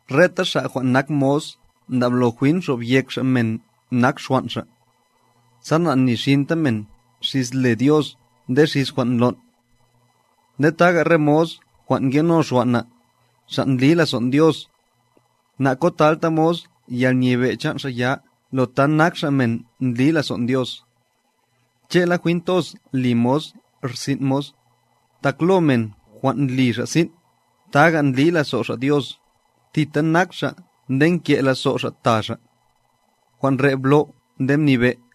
Reta xa' jwan' nak mos ndablo jwin xobyek xa' men nak xwan' xa', sa na'nixinta men xis le Dios nde xis jwan' ndlon'. Nde taga' re mos jwan' ngeno xwan' na', xa' ndli lazon' Dios, nakotalta mos yalnyebe' chan' xa' ya lo ta nak xa' men ndli lazon' Dios. Che'la jwin toz li mos rsin' mos, tak lo men jwan' ndli xa' sin', taga' ndli lazo' xa' Dios, thita nak xa' nde nke lazo' xa' ta xa'. Jwan' re' blo' nde mnibe'.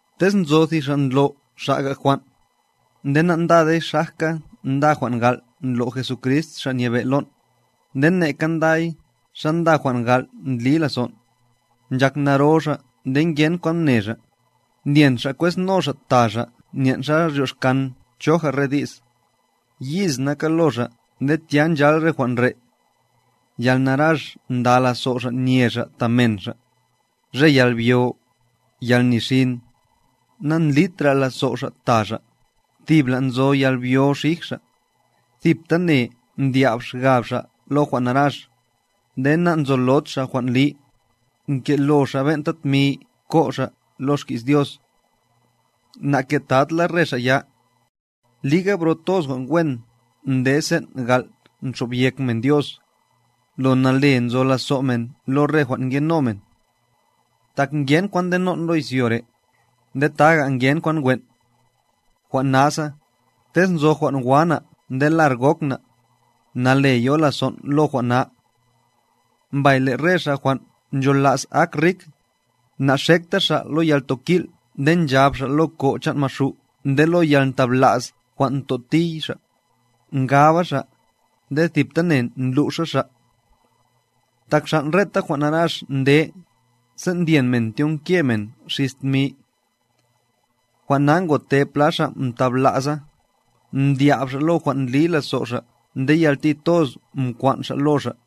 Tez nzo thi xa' ndlo' xa'ga jwan', nde nandade xajka nda jwan' gal' ndlo' Jesucrist Xa' Nyebe' lon', nde neka nday xa nda jwan' gal' ndli lazon', nchak naro xa' nde ngen kwan mne xa', ndyen xa' kwezno xa' ta xa' nyen' xa ryoxkan choja re di's, yiz naka lo xa' nde tya nchal re jwan' re': Yalnarax nda lazo' xa' nye xa' ta men xa', re yalbyo, yalnixin, nandlitra lazo' xa' ta xa', tibla nzo yalbyo xij xa', thiptane mdya'b xgab xa' lo jwan' narax, nde nanzolod xa' jwan' li, nkelo xa' ben'ta tmi ko' xa' lo xki's Dios. Naketad la re xa' ya. Liga, bro toz jwan' wen nde sen' gal' nxo'byek men Dios, lo nale nzo lazo' men lo re jwan' ngeno men. Tak ngen kwan ndenon' lo izyo re', nde taga' ngen kwan wen'. Jwan' nasa, tez nzo jwan' wa na' nde lar gok na', nale yo lazon' lo jwan' na. Mbay le' re xa' jwan' nchola's ak rik, naxekta xa' lo yaltokil' nde nchab xa' lo ko' chan' Maxu' nde lo yalntabla's jwan' ntotiy xa', ngaba xa', nde thiptane ndlu'xa xa'. Tak xan' reta jwan' narax nde, sen' ndyen men tyonke men xis tmi. Jwan' na ngote pla xa' mtabla'sa, mdya'b xa' lo jwan' ndli lazo' xa' nde yalti toz mkwan' xa' lo xa'.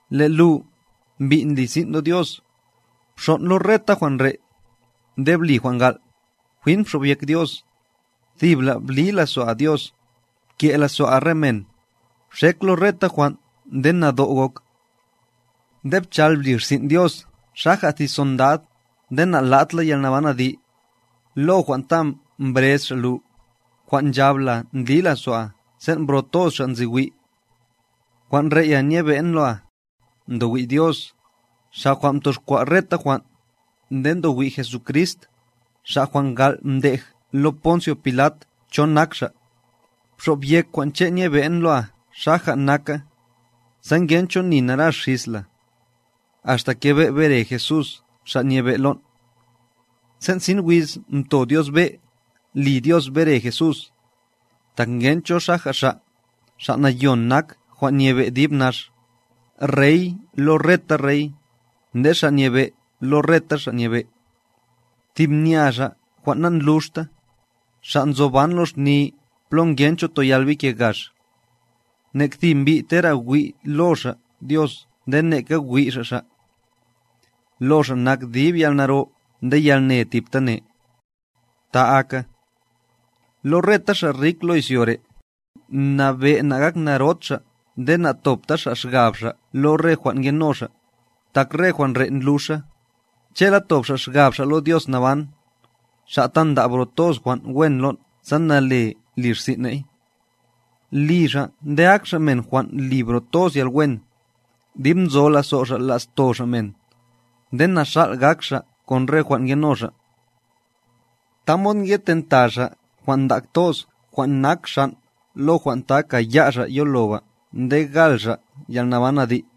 Le' lu, mbi' ndli sin' lo Dios, bxon' lo reta jwan' re', nde bli jwan' gal', jwin bxobyek Dios, thibla' bli lazo'a Dios, pke' lazo'a re men, bxek lo reta jwan' nde nado' gok. Ne bchal bli rsin' Dios xaja' thi sondad, nde na'lad la yalnaban adi', lo jwan' ta mbrez Xa' lu, jwan' nchab la ndli lazo'a sen' bro toz xa' nzi wi'. Jwan' re'ya nyebe'n loa, ndowi' Dios, Xa' jwan' mtoxkwa' reta jwan', nde ndowi' Jesucrist, Xa' jwan' gal' mdej lo Poncio Pilat cho nak Xa', bxob yek jwan' che' nyebe'n loa xaja' naka, sa ngencho ni narax xis la, axta kebe' bere Jesús Xa' Nyebe' lon'. Sen' sin wiz mto Dios be' li Dios bere Jesús, tak ngencho xaja' Xa', Xa' Nayon nak jwan' nyebe' dib nax, Rey lo reta rey, nde Xa' Nyebe' lo reta xa' nyebe'. Thib nya Xa' jwan' nandluxta, Xa' nzoban lo xni plo ngencho toyal bike gax. Nek thi mbi' tera' wi' lo xa' Dios nde neka wi' xa' Xa'. Lo Xa' nak dib yalnaro nde yalne tibtane. Ta aka. Lo reta xa' rik lo izyo re', mnabe' na'gaknarod xa' nde na'tobta xa' xgab xa' lo re jwan' ngeno' xa', tak re jwan' re' ndluxa, che'la tob xa' xgab xa' lo Dios naban, Xa' ta nda' bro toz jwan' wen lon' sa nale li rsin' ne'y. Li xa' nde ak xa' men jwan' li bro toz yalwen, dib nzo lazo' xa' la'sto xa' men, nde naxal' gak xa' kon re jwan' ngeno xa'. Tamod ngetenta xa' jwan' ndak toz jwan' nak xan' lo jwan' ta kaya' xa' yoloba nde gal xa' yalnaban adi'.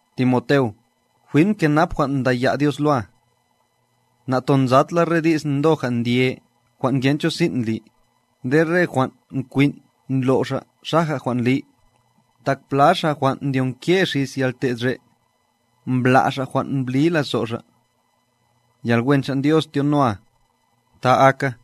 Timoteo, jwin bkenap jwan' ndaya' Dios loa. Natonzad la re di's ndoja' ndye jwan' ngencho sin' ndli, nde re jwan' kwin' ndlo' xa' xaja' jwan' li, tak pla xa' jwan' ndyonke xis yalte'd re', mbla' xa' jwan' mbli lazo' xa'. Yalwen chan' Dios tyonoa. Ta aka.